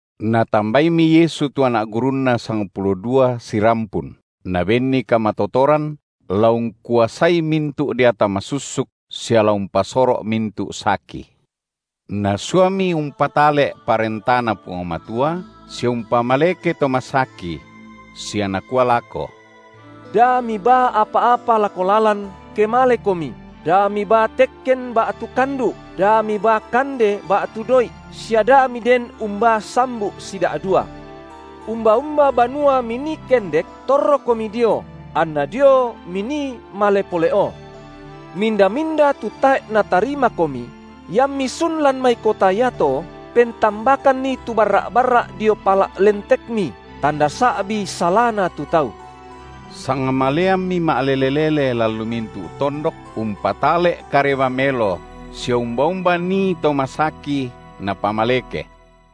Natambaimi Yesu tu anak gurunNa sangpulo dua sirampun, Nabenni kamatotoran la ungkuasai mintu’ deata masussuk sia la umpasoro’ mintu’ saki. Nasuami umpatale’ ParentaNa Puang Matua sia umpamaleke to masaki; sia Nakua lako: Da mibaa apa-apa lako lalan, ke malekomi, da mibaa tekken ba’tu kandu’, da mibaa kande ba’tu doi’, sia da miden umbaa sambu’ sida’dua. Umba-umba banua minii kendek, torrokomi dio, anna dio minii male pole’o. Minda-minda tu tae’ natarimakomi, iammi sun lan mai kota iato, pentambakanni tu barra’-barra’ dio pala’ lentekmi, tanda sa’bi salana tu tau. Sangmaleammi ma’lele-lele lan lu mintu’ tondok umpatale’ kareba melo sia umba-umba nii to masaki, napamaleke.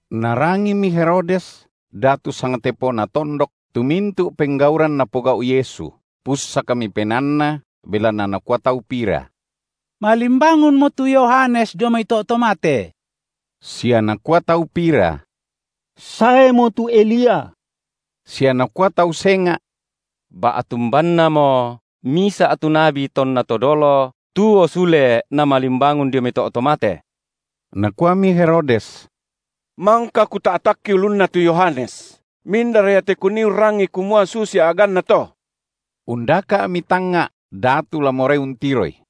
Narangimi Herodes, datu sangtepona tondok, tu mintu’ penggauran Napogau’ Yesu, pussakmi penaanna, belanna nakua tau pira: malimbangunmo tu Yohanes dio mai to’ to mate. Sia nakua tau pira: saemo tu Elia; sia nakua tau senga’: ba’tu umbannamo misa’ tu nabi tonna to dolo tuo sule namalimbangun dio mai to’ to mate. Nakuami Herodes: Mangka kuta’takki ulunna tu Yohanes, mindara ia te kunii urrangi kumua susi a’ganna to? Undaka’mi tangnga’ datu la morai untiroI.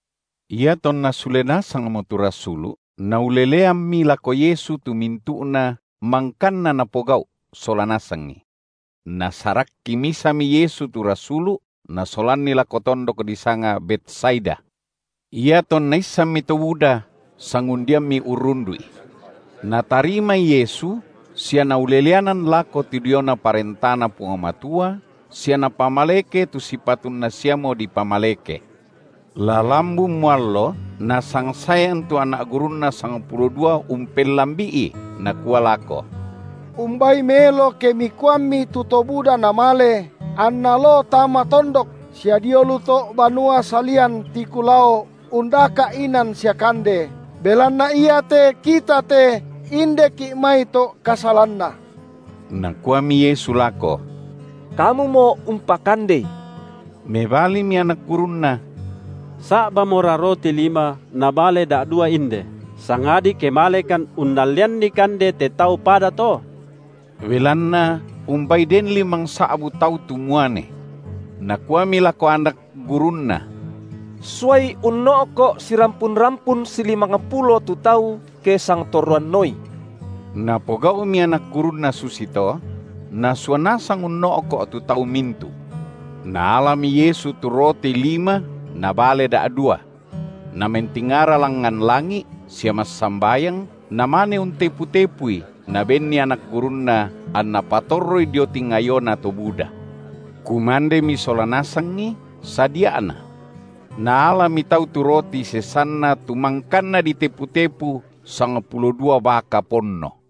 Iatonna sule nasangmo tu rasulu’, nauleleammi lako Yesu tu mintu’na mangkanna napogau’ sola nasangi. Nasarakki misami Yesu tu rasulu’, Nasolanni lako tondok disanga Betsaida. Iatonna issanmi to buda, sangundiammi urrundu’I. Natarimai Yesu sia Nauleleanan lako tu diona ParentaNa Puang Matua sia Napamaleke tu sipatunna siamo dipamaleke. La lambunmo allo, nasangsaean tu anak gurunNa sangpulo dua umpellambi’i, nakua lako: Umbai melo ke Mikuammi tu to buda namale, anna loo tama tondok, sia dio lu to’ banua salian tiku lao undaka’ inan sia kande, belanna iate kita te indeki’ mai to’ kasalanna. Nakuami Yesu lako: Kamumo umpakandei. Mebalimi anak gurunNa: Sa’bamora roti lima na bale da’dua inde, sangadi ke malekan unnallianni kande te tau pada to. Belanna umbai den limangsa’bu tau tu muane. Nakuami lako anak gurunNa: Suai unno’ko’ sirampun-rampun silimangpulo tu tau, ke sangtorroanoi. Napogau’mi anak gurunNa susito; nasua nasang unno’ko’ tu tau mintu’. Naalami Yesu tu roti lima na bale da’dua. Namentingara langngan langi’ sia massambayang, Namane untepu-tepui, Nabenni anak gurunNa, anna patorroi dio tingayona to buda. Kumandemi sola nasangi, sadia’na. Naalami tau tu roti sesanna tu mangkanna ditepu-tepu sangpulo dua baka ponno.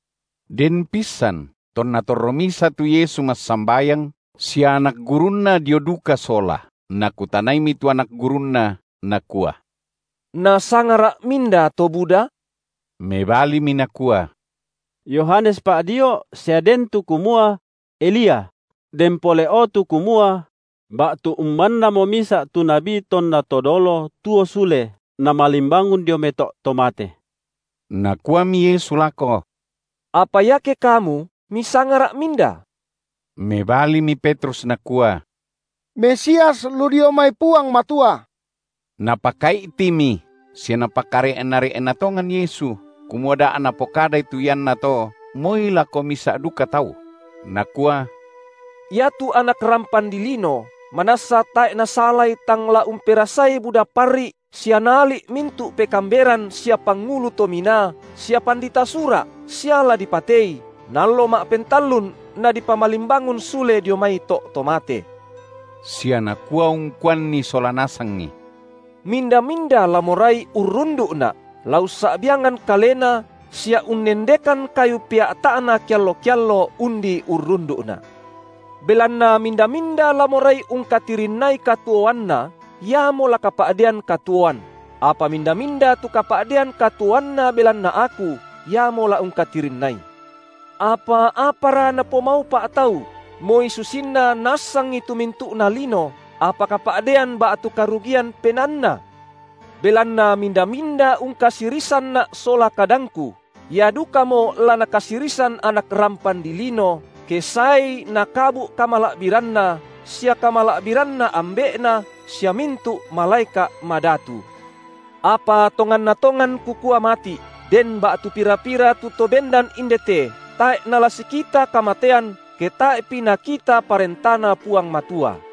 Den pissan tonna torro misa tu Yesu massambayang sia anak gurunNa dio duka sola, Nakutanaimi tu anak gurunNa. Nakua: NasangaRa’ minda to buda? Mebalimi nakua: Yohanes Pa’dio’, sia den tu kumua: Elia; den pole’o tu kumua: ba’tu umbannamo misa’ tu nabi tonna to dolo tuo sule namalimbangun dio mai to’ to mate. Nakuami Yesu lako: Apa iake kamu misangaRa’ minda? Mebalimi Petrus nakua: Mesias lu dio mai Puang Matua. Napakai’timi sia Napakare’na-re’na tongan Yesu, kumua da napokadai tu iannato moi lako misa’ duka tau. Nakua: Iatu Anak rampan dilino manassa tae’ nasalai tang la umperasai buda parri’ sia la naali’ mintu’ pekaamberan sia pangulu to minaa sia pandita Sura’ sia la dipatei, na allo ma’pentallun Nadipamalimbangun sule dio mai to’ to mate. Sia nakua ungkuanni sola nasangi: Minda-minda la morai urrundu’Na’, la ussa’biangan kalena sia unnendekan kayu pea’ta’na keallo-keallo undi urrundu’Na’. Belanna minda-minda la morai ungkatirinnai katuoanna, iamo la kapa’dean katuoan, apa minda-minda tu kapa’dean katuoanna tu belanna Aku, iamo la ungkatirinnai. Apa apara napomaupa’ tau, moi susinna naassangi tu mintu’na lino, apa kapa’dean ba’tu karugian penaanna? Belanna minda-minda ungkasirisanNa’ sola kadangKu, ia dukamo la Nakasirisan Anak rampan dilino, ke saeI nakabu’ kamala’biranNa sia kamala’biranNa Ambe’Na sia mintu’ malaeka’ madatu. Apa tonganna tongan Kukua mati’, den ba’tu pira-pira tu to bendan inde te tae’ nala sikita kamatean, ke tae’pi nakita ParentaNa Puang Matua.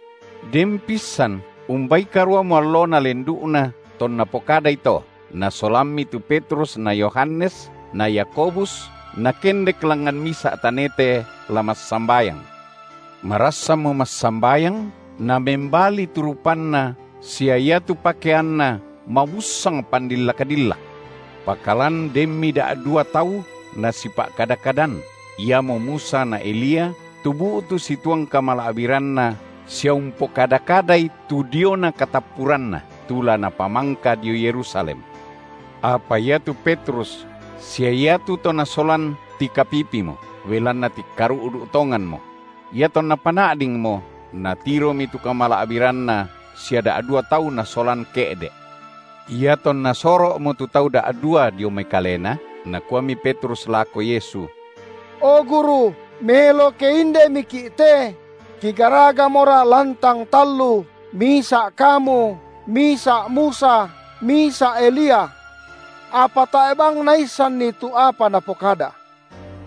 Den pissan umbai karuamo allona lendu’na tonna pokadai to, Nasolammi tu Petrus na Yohanes na Yakobus, Nakendek langngan misa’ tanete la massambayang. Marassanmo massambayang namembali tu rupanNa sia iatu pakeanNa mabussang pandillak-dillak. Pakalan denmi da’dua tau Nasipa’kada-kadan, iamo Musa na Elia, tu bu’tu situang kamala’biranna sia umpokada-kadai tu diona katappuranNa, tu la Napamangka dio Yerusalem. Apa iatu Petrus sia iatu to nasolan tikapipimo, belanna tikkaru’du’ tonganmo; iatonna pana’dingmo, natiromi tu kamala’biranNa sia da’dua tau Nasolan ke’de’. Iatonna soro’mo tu tau da’dua dio mai Kalena, nakuami Petrus lako Yesu: O, Guru! melo ke indemiki’ te! kigaragamora lantang tallu, misa’ Kamu, misa’ Musa, misa’ Elia. Apa tae’ bang naissanni tu apa napokada.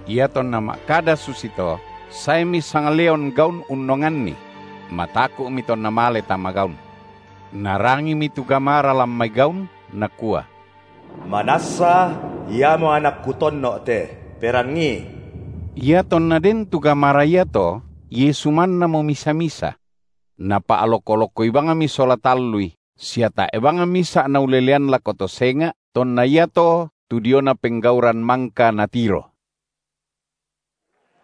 Iatonna ma’kada susito, saemi sangleon gaun unnonganni; mataku’mi tonna male tama gaun. Narangimi tu gamara lan mai gaun, nakua: Manassa Iamo Anak Kutonno’ te, perangii. Iatonna den tu gamara iato Yesu mannamo misa-misa. Napa’loko-lokoi bangmi sola tallui, sia tae’ bang misa’ naulelean lako to senga’ tonna iato tu diona penggauran mangka natiro.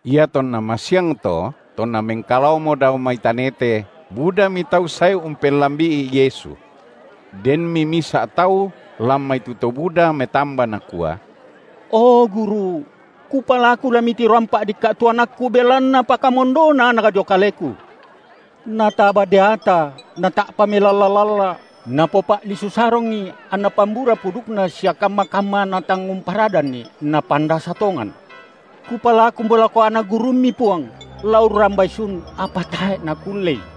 Iatonna masiangto, tonna mengkalaomo dao mai tanete, budami tau sae umpellambi’i Yesu. Denmi misa’ tau lan mai tu to buda metamba nakua: O Guru! Kupalaku la Mitiroampa’ dikka’ anakku, belanna pakamondona anak dio kaleku. Nataba deata, nata’pa melalla-lalla, napopa’lisu sarongi, anna pambura pudukna sia kamma-kamma natang umparadanni napandasa tongan. Kupalakumo lako anak gurumMi, Puang, la urrambai sun, apa tae’ nakullei.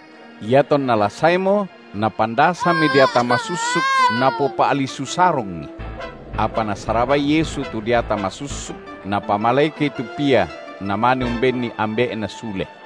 Iatonna la saemo napandasami deata masussuk napopa’lisu sarongi. Apa Nasarabai Yesu tu deata masussuk, Napamalekei tu pia, Namane umbenni ambe’na sule.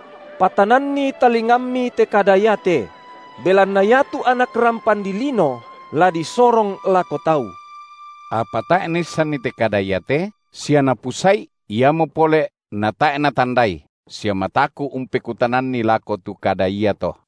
Patananni talingammi te kada iate: Belanna iatu Anak rampan dilino la disorong lako tau. Apa tae’ naissanni te kada iate, sia napusa’i, iamo pole’ natae’ natandai, sia mataku’ umpekutananni lako tu kada iato.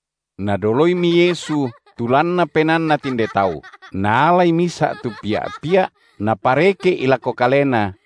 Nadoloimi Yesu tu lanna penaanna tinde tau, Naalai misa’ tu pia’-pia’ Napareke’i lako Kalena,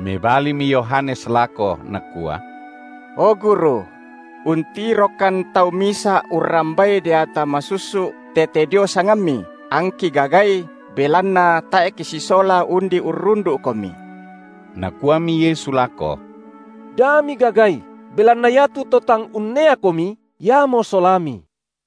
Mebalimi Yohanes lako, nakua: O Guru! Untirokan tau misa’ urrambai deata masussuk tete dio sangamMi, angki gagai, belanna tae’ kisisola undi urrundu’Komi. Nakuami Yesu lako: Da migagai, belanna iatu to tang unneakomi, iamo solami.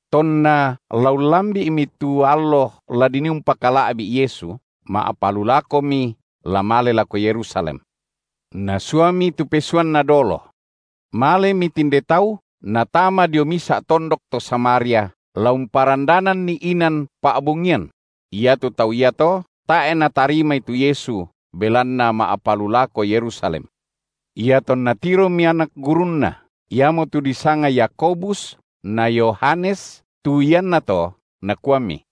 Tonna la ullambi’mi tu allo la dinii umpakala’bi’ Yesu, ma’palulakomi, la male lako Yerusalem. Nasuami tu pesuanNa dolo. Malemi tinde tau natama dio misa’ tondok to Samaria, la umparandananNi inan pa’bongian; iatu tau iato tae’ natarimai tu Yesu, belanna ma’palulako Yerusalem. Iatonna tiromi anak gurunNa, iamotu disanga Yakobus na Yohanes, tu iannato, nakuami: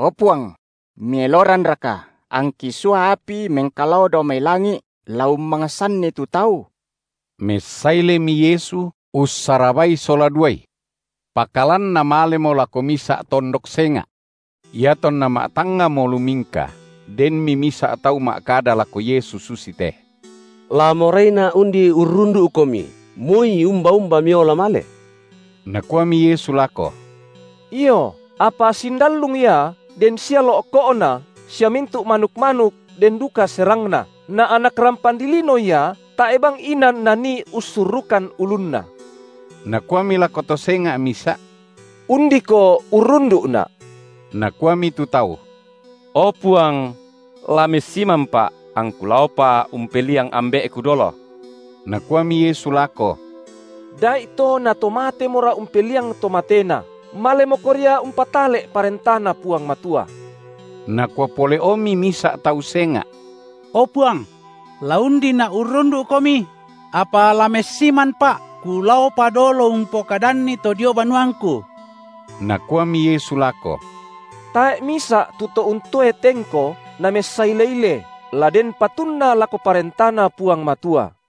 O Puang! Mieloranraka angki sua api mengkalao dao mai langi’ la ummangsanni tu tau? Messailemi Yesu, ussarabai sola duai. Pakalan namalemo lako misa’ tondok senga’. Iatonna matangngamo lumingka, denmi misa’ tau ma’kada lako Yesu susite: La moraina’ undi urrundu’Komi, moi umba-umba Miola male. Nakuami Yesu lako: Io, apa sindallung ia den sia lo’ko’na sia mintu’ manuk-manuk den duka serangna, na Anak rampan dilino Ia tae’ bang inan Nanii ussurrukan ulunNa. Nakuami lako to senga’ misa’: Undiko urrundu’Na’! Nakuami tu tau: O Puang! La messimanpa’ angku laopa umpeliang ambe’ku dolo. Nakuami Yesu lako: Da’ito na to matemora umpeliang to matena, malemoko ria umpatale’ ParentaNa Puang Matua. Nakua pole’omi misa’ tau senga’: O Puang! la undina’ urrundu’Komi; apa la messimanpa’ kulaopa dolo umpokadanni to dio banuangku. Nakuami Yesu lako: Tae’ misa’ tu to untoe tengko, namessaile-ile, la den patunna lako ParentaNa Puang Matua.